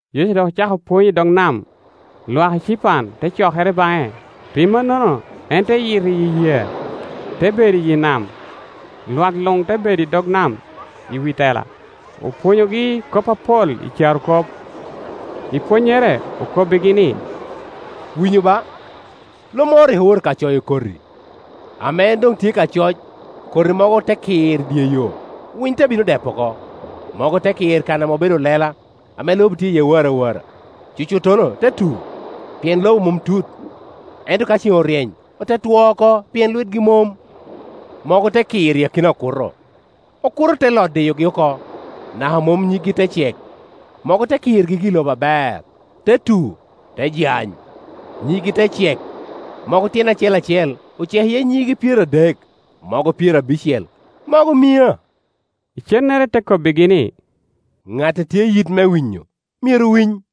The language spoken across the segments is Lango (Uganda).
Yecu dok ocako pwony i dog nam. Lwak ecipan te cokere baŋe; pi mannono en te yito iyi yee; te bedo iye i nam, lwak luŋ te bedo i dog nam i wi tela. Opwonyogi kop apol i carokop. I pwonnyere okobbigi ni, “Winyu ba! Lo moro rik owoto ka coyo koti. Ame en doŋ tye ka coc, koti mogo te kir i dye yo, winy te bino depo oko. Mogo te kir kan obedo lela, ame lobo tye iye warawara. Cucuttono te tu, pien lobo mom tut; ento ka ceŋ oryeny ote two oko, pien lwitgi mom. Mogo te kir i akina okuto, okuto te lot diyogi oko, naka mom nyiggi te cek. Mogo te kir gigi i lobo aber, te tu, te jany, nyiggi te cek; mogo tyene acel acel ocek iye nyige pyeradek, mogo pyerabicel, mogo mia.” Icennere te kobbigi ni, “Ŋat a tye i yit me winyo, myero winy.”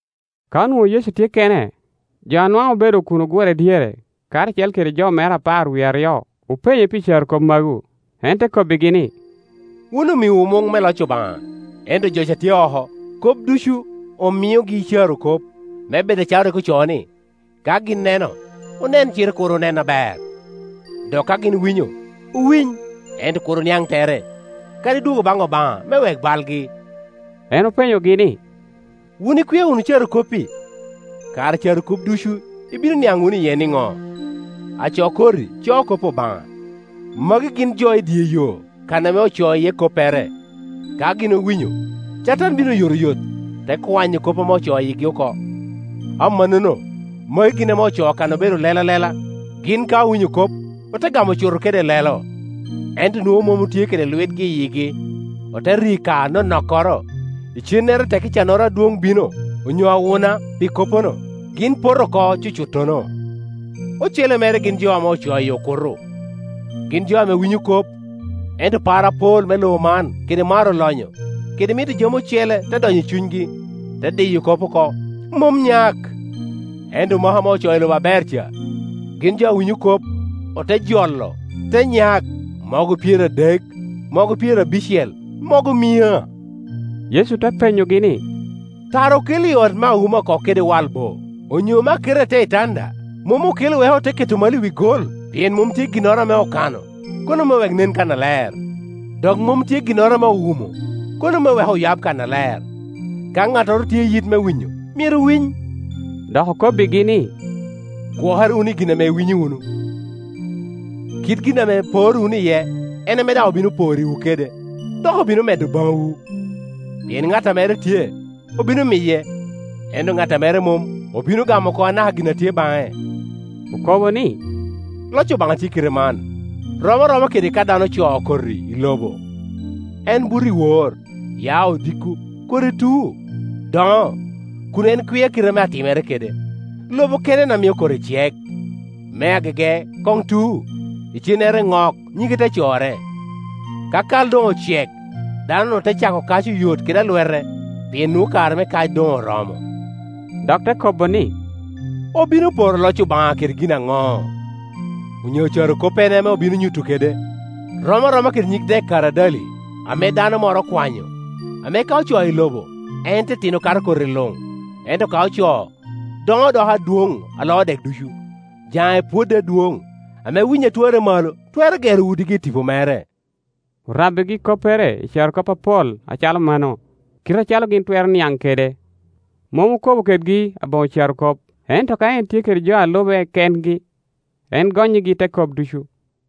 Ka onwoŋo Yecu tye kene, jo anwaŋ obedo kun ogure dyere karacel kede jo mere apar wie aryo openye pi carokop magu. En te kobbigi ni, “Wun omiowu muŋ me loc Obaŋa, ento jo ca a tye oko, kop ducu omiogi i carokop, me bed acalo rik ocoo, ni, ‘Ka gin neno, onen cite kur onen aber, dok ka gin winyo, owiny, ento kur oniaŋ tere, kadi dwogo baŋ Obaŋa me wek balgi.’” En openyogi ni, “Wun ikwia wunu carokop-pi? Kara i carokop ducu ibino niaŋ wunu iye niŋo? Aco koti coo kop Obaŋa. Magi gin jo i dye yo kan ame ocoo iye koppere; ka gin owinyo, Catan bino oyotoyot, te kwanyo kop ame ocoo i yigi oko. Amannono magi gin ame ocoo kan obedo lela lela; gin ka owinyo kop, ote gamo cuto kede lelo, ento nwoŋo mom otye kede lwitgi i yigi. Ote ri ka anonokkoro; icennere tekki cannoro adwoŋ bino, onyo awuna, pi koppono, gin poto oko cucuttono. Ocele mere gin jo ame ocoo i okuto; gin jo ame winyo kop, ento par apol me lobo man; kede maro lonyo, kede mito jami ocele te donyo i cunygi, te diyo kop oko, mom nyak. Ento maka ame ocoo i lobo aber ca, gin jo a winyo kop, ote jolo, te nyak mogo pyeradek, mogo pyerabicel, mogo mia.” Yecu te penyogi ni, “Tara okelo i ot me awuma oko kede wal bo, onyo me aketa i te itanda? Mom okelo wek ote keto malo wi gol? Pien mom tye ginnoro ame okano, kono me wek nen kannaler; dok mom tye ginnoro ame owumo, kono me wek oyab kannaler. Ka ŋattoro tye i yit me winyo, myero winy!” Dok okobbigi ni, “Gwokere wunu i gin ame iwinyo wunu; kit gin ame iporo wunu iye, en ame daŋ obino porriwu kede, dok obino medo baŋwu. Pien ŋat a mere tye, obino miye; ento ŋat a mere mom, obino gamo oko anaka gin a tye baŋe.” Okobo ni, “Loc Obaŋa tye kite man, rom aroma kede ka dano ocoo koti i lobo; en buto iwor, ya odiko, koti tu, doŋo, kun en kwia kite ame atimere kede. Lobo kene en a mio koti cek; me agege koŋ tu, icennere nok, nyige te corre. Ka kal doŋ ocek, dano-nu te cako kac oyot kede alwete, pien nwoŋo kare me kac doŋ oromo.” Dok te kobo ni, “Obino poro loc Obaŋa kede gin aŋo? Onyo carokoppene ame obino nyuto kede? Rom aroma kede nyig dek karadali ame dano moro okwanyo, ame ka ocoo i lobo, en titino kato koti luŋ; ento ka ocoo, doŋo doko adwoŋ a loo dek ducu, jaŋe pwodde adwoŋ, ame winyi a twarre malo twero gero udigi i tipo mere.” Orabbigi koppere i carokop apol acalo mano, kite acalo gin twero niaŋ kede. Mom okobo kedgi aboŋo carokop, ento ka en tye kede jo a lube kengi, en gonnyigi te kop ducu.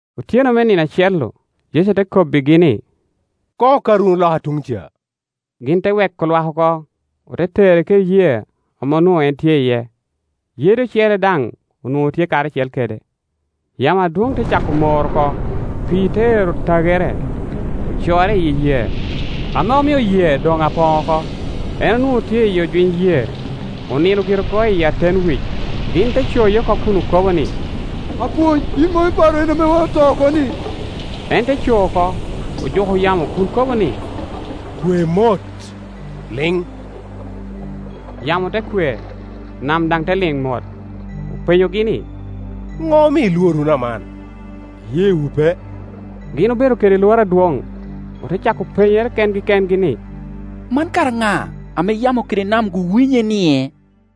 Otyeno me nino acel-lu Yecu te kobbigi ni, “Koŋ okat wunu loka tuŋ ca.” Gin te weko lwak oko, ote tere kede yee ame onwoŋo en tye iye; yede ocele daŋ onwoŋo tye karacel kede. Yamo adwoŋ te cako mor oko, pii te ero tagere, ocorre iyi yee, ame omio yee doŋ apoŋ oko. En onwoŋo tye i ojwiny yee, onino gire oko i aten wic. Gin tecoye oko kun okobo ni, “Apwony, yin mom iparo en ame oto oko-ni?” En te co oko, ojuko yamo kun kobo ni, “Kwe mot! Liŋ!” Yamo te kwe, nam daŋ te liŋ mot. Openyogi ni, “Ŋo omio ilwor wunu aman? Iyeewu pe?” Gin obedo kede lworo adwoŋ, ote cako penyere kengi kengi ni, “Man kara ŋa, ame yamo kede nam-gu winye-nie?”